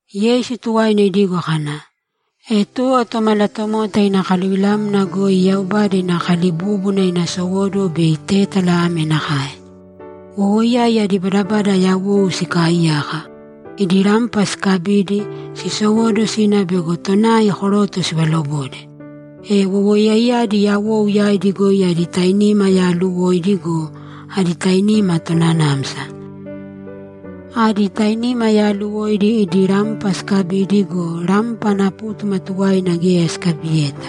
Yeisu tuwaina idigo kana, ‘E tuwo Tomalatomota ina kaluvilamna goi Yaubada ina kalibúbuna ina sowóduwo bei tétala ame nakae: Wowoiyai adi badabada yawou sikaaiyaka. Idi rampa sikabidi, sisowóduwo sina bego tonai koroto sivalobode. E wowoiyaiyadi yawou yaidi goi adi tainima yaaluwoidi go, adi tainima tonanamsa. Adi tainima yaaluwoidi idi rampa sikabidi go, rampa ana pútuma tuwaina geya sikabiyeta.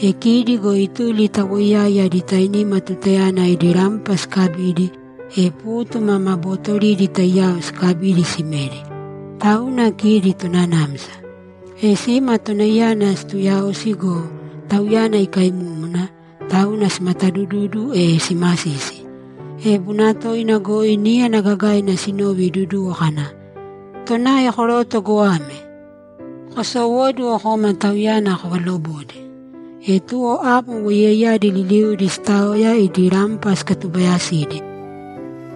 E kidi go ituli ta woiyai adi tainima tutayana idi rampa sikabidi, e pútuma ma bootoridi taiyao sikabidi simedi. Tauna kidi tonanamsa. E sima tonaiyana situuyaosi go, tauyana ikaimúmuna, tauna simatadududu, e simasisi. E bunatoina goi níyana gagaina sinove iduduwo kana, “Tonai koroto goame! Kosowōduwo kōma tauyana kovalobōde.” E tuwo amo wowoiyaiyadi liliudi sitaoya idi rampa sikatubayasidi.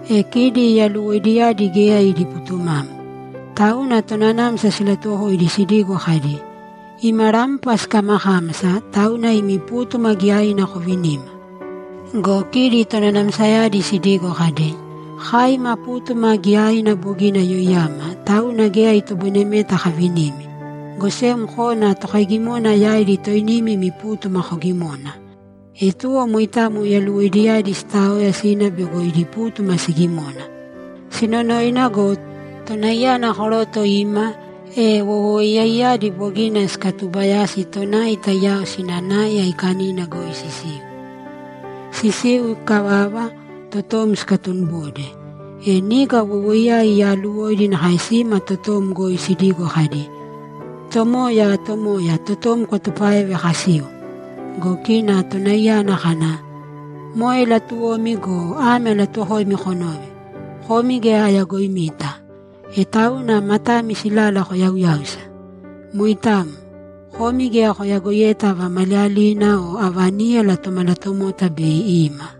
E kidi yaluwoidiyadi geya idi putumamo. Tauna tonanamsa silatuwokoidi sidigo kadi, “Ima rampa sikamakámasa, tauna imi pútuma giyaina kovinīma.” Go kidi tonanamsayadi sidigo kadi, “Kai ima pútuma giyaina bogina yoiyama, tauna geya itoboinemeta kavinimi, go sem kōna tokaigimona yaidi toinimi imi pútuma kogimōna.” E tuwo moitamo yaluwoidiyadi sitaoya sina bego idi pútuma sigimona. Sinonoina go, tonaiyana koroto ima, e wowoiyaiyadi bogina sikatuubayasi tonai taiyao sina nai aikanina goi sisiu. Sisiu ikavava, totom sikatunibode. E niga wowoiyai yaluwoidiyadi nakae sima totom goi sidigo kadi, “Tomoya, Tomoya, totom kwatupāeve kasiu!” Go kina tonaiyana kana, “Moe latuwomi go, ame alatuuwokoimi konōve: Komi geya ayagoimita.” E tauna matami silala koyauyāusa. Moitamo. Komi geya koyagoiyeta ava maliyalina o ava níyala Tomalatomota bei ima.’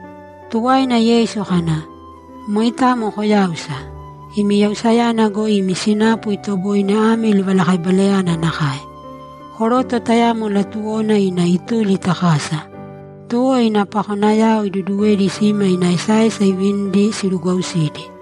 Tuwaina Yeisu kana, ‘Moitamo koyāusa. Imi yausayana goi imi sinapu itoboine ame livalakaibalayana nakae: Koroto tayamo latuwona ina ituli ta kasa. Tuwo ina pakonayao iduduwedi sima ina esaesa ivinidi sirugwausidi.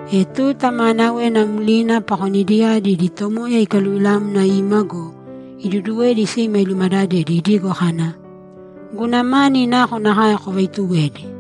E tuta maanawena mlina pakonidiyadi idi tomoya ikaluvilamna ima go, iduduwedi sima ilumadadedi idigo kana, “Guna mani nakonakae kovaituwedi?”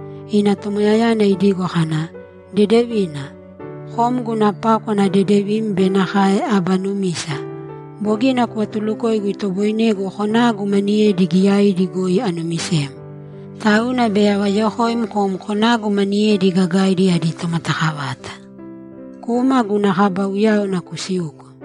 Ina tomoyayana idigo kana, “Dedevina! Kom guna pákwana dedevim be nakae aba numisa. Bogina kuvatulukoigu itoboinegu konagu maniyedi giyaidi goi anumisem. Tauna bei avayokoim kom konagu maniyedi gagaidi adi tomatakavata. Kūma guna kaba uyáwana kusīuko.”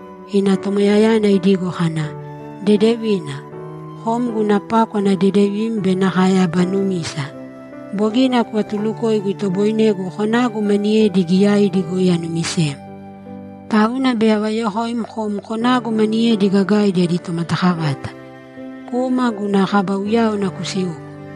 Ina tomoyayana idigo kana, “Dedevina! Kom guna pákwana dedevim be nakae aba numisa. Bogina kuvatulukoigu itoboinegu konagu maniyedi giyaidi goi anumisem. Tauna bei avayokoim kom konagu maniyedi gagaidi adi tomatakavata. Kūma guna kaba uyáwana kusīuko.”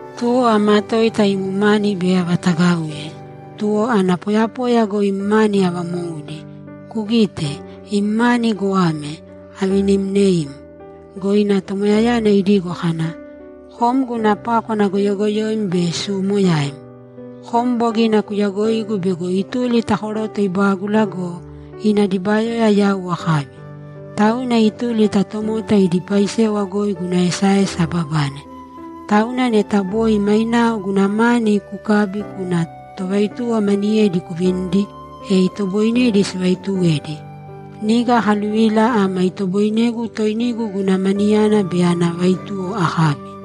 Tuwo amatoita im mani bei avatagauye, tuwo ana poyapoya goi im mani avamoudi. Kugīte, im mani goame; avinimneim.” Go ina tomoyayana idigo kana, “Kom guna pákwana goyogoyoim be suumoyaim! Kom bogina kuyagoigu bego ituli ta koroto ibágula go, ina dibayoya yau akabi. Tauna ituli ta tomota idi paisewa goi guna esaesa ababane. Tauna neta boi mainao guna mani kukabi kuna tovaituwo maniyedi kuvinidi, e itoboinedi sivaituwedi. Niga akaluvila ama itoboinegu toinigu guna maniyana be ana vaituwo akabi.”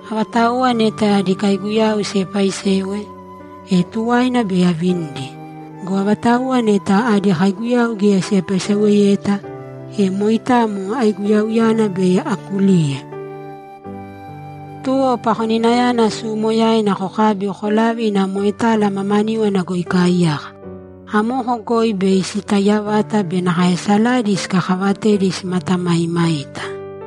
Avatauwa neta adi kaiguyau siepaaisewe, e tuwaina bei avinidi. Go avatauwa neta adi kaiguyau geya siepaiseweyeta, e moitamo aiguyauyana bei akuliuye. Tuwo pakoninayana suumoyaina kokābi kolāve ina moetala mamaníwana goi ikaaiyaka. Amoko goi bei sitaiya vata be nakae saladi sikakaavatedi simatamaimaita.”’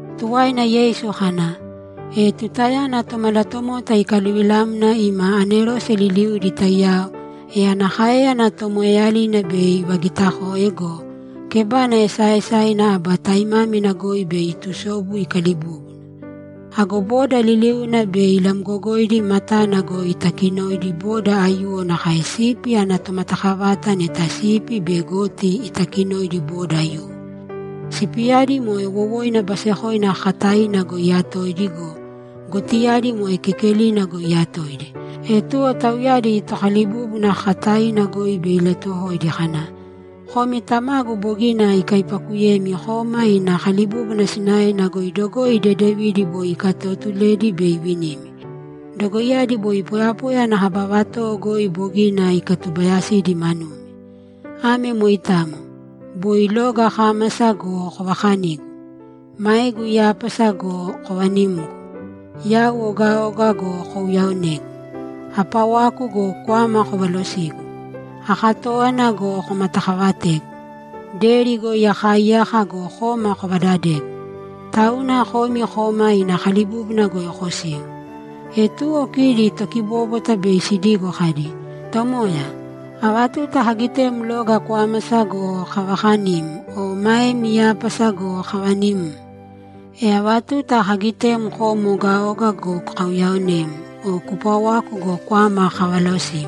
Tuwaina Yeisu kana, ‘E tutayana Tomalatomota ikaluvilamna ima anerose liliudi taiyao, e ana káeyana tomoeeyalina bei ivagitakoe go, kebana esaaesaina aba taimámina goi bei itusobu ikalibúbuna. Ago boda liliuna bei ilamgogoidi matana goi itakinoidi boda aiyuwo nakae sipi ana tomatakavata neta sipi be goti itakinoidi boda aiyuwo. Sipiyadi moe wowoina basekoina kakataina goi iyatoidi go, gotiyadi moe kekelina goi iyatoidi. E tuwo tauyadi Tokalibúbuna kakataina goi bei ilatuwokoidi kana, “Komi Tamagu bogina ikaipaakuyemi kōma ina kalibúbuna sinaena goi dogoi dedevidi boi ikatootuledi bei ivinimi. Dogoiyadi boi poyapoya ana kaba vatowo goi bogina ikatubayasidi manumi. Ame moitamo. Boi loga akámasa go, kovakanigu. Maegu iyápasa go, kovanimgu. Yau ogaoga go, kouyaonegu. Apawaku go, kwama kovalosigu. Akatówana go, komatakavategu. Deri goi akaaiyaka go, koma kovadadegu. Tauna komi kōma ina kalibúbuna goi kosīu.” E tuwo kidi tokibóbwata bei sidigo kadi, “Tomoya, ava tuta kagitem loga kwámasa go, kavakanim o maem iyápasa go, kavanimm? E ava tuta kagitem kom ogaoga go, kauyaonem o kupawaku go, kwama kavalosim?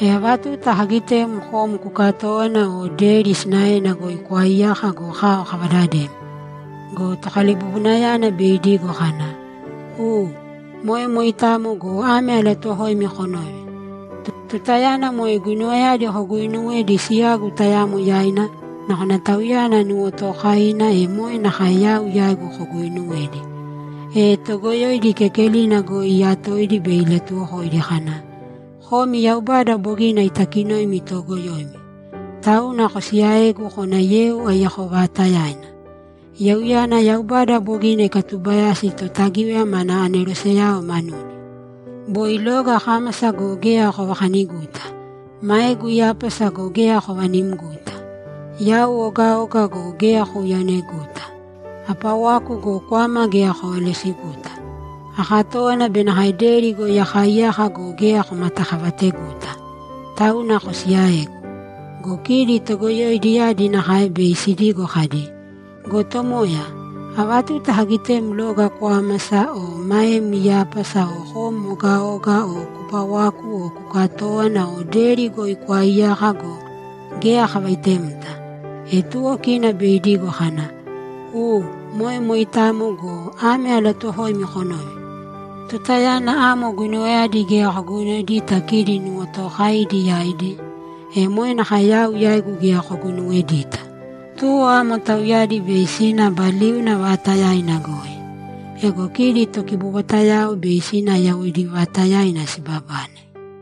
E ava tuta kagitem kom kukatówana o deri sinaena goi kwaaiyaka go, kao kavadadem?” Go tokalibubunayana bei idigo kana, “U, moe moitamo go, ame alatuuwokoimi konōve: Tutayana moe guinuwayadi koguuinuwedi siyagu tayamo yaina, nakona tauyana nuwotookaina, e moe nakae yau yaigu koguuinuwedi.” E toogoyoidi kekelina goi iiyatoidi bei ilatuwokoidi kana, “Komi Yaubada bogina itakinoimi toogoyoimi. Tauna kosiyaēgu kōna yeu aiyako vaatayaina! Yeuyana Yaubada bogina ikatubayasi Totagíwaya mana aneroseyao manudi. Boi loga akámasa go, geya kovakaniguta. Maegu iyápasa go, geya kovanimguta. Yau ogaoga go, geya kouyaoneguta. Apawaku go, kwama geya kovalosiguta. Akatówana be nakae deri goi akaaiyaka go, geya komatakavateguta. Tauna kosiyaēgu.” Go kidi togoyoidiyadi nakae bei sidigo kadi, “Go Tomoya, ava tuta kagitem loga kwámasa o maem iyápasa o kom ogaoga o kupawaku o kukatówana o deri goi kwaaiyaka go, geya kavaitemta?” E tuwo kina bei idigo kana, “U, moe moitamo go, ame alatuuwokoimi konōve: Tutayana amo guinuwayadi geya koguinuwedita kidi nuwotookaidi yaidi, e moe nakae yau yaigu geya koguinuwedita.” Tuwo amo tauyadi bei sina aba liuna vaatayaina goi. Ego kidi tokibobwatayao bei sina yawoidi vaatayaina sibabane.’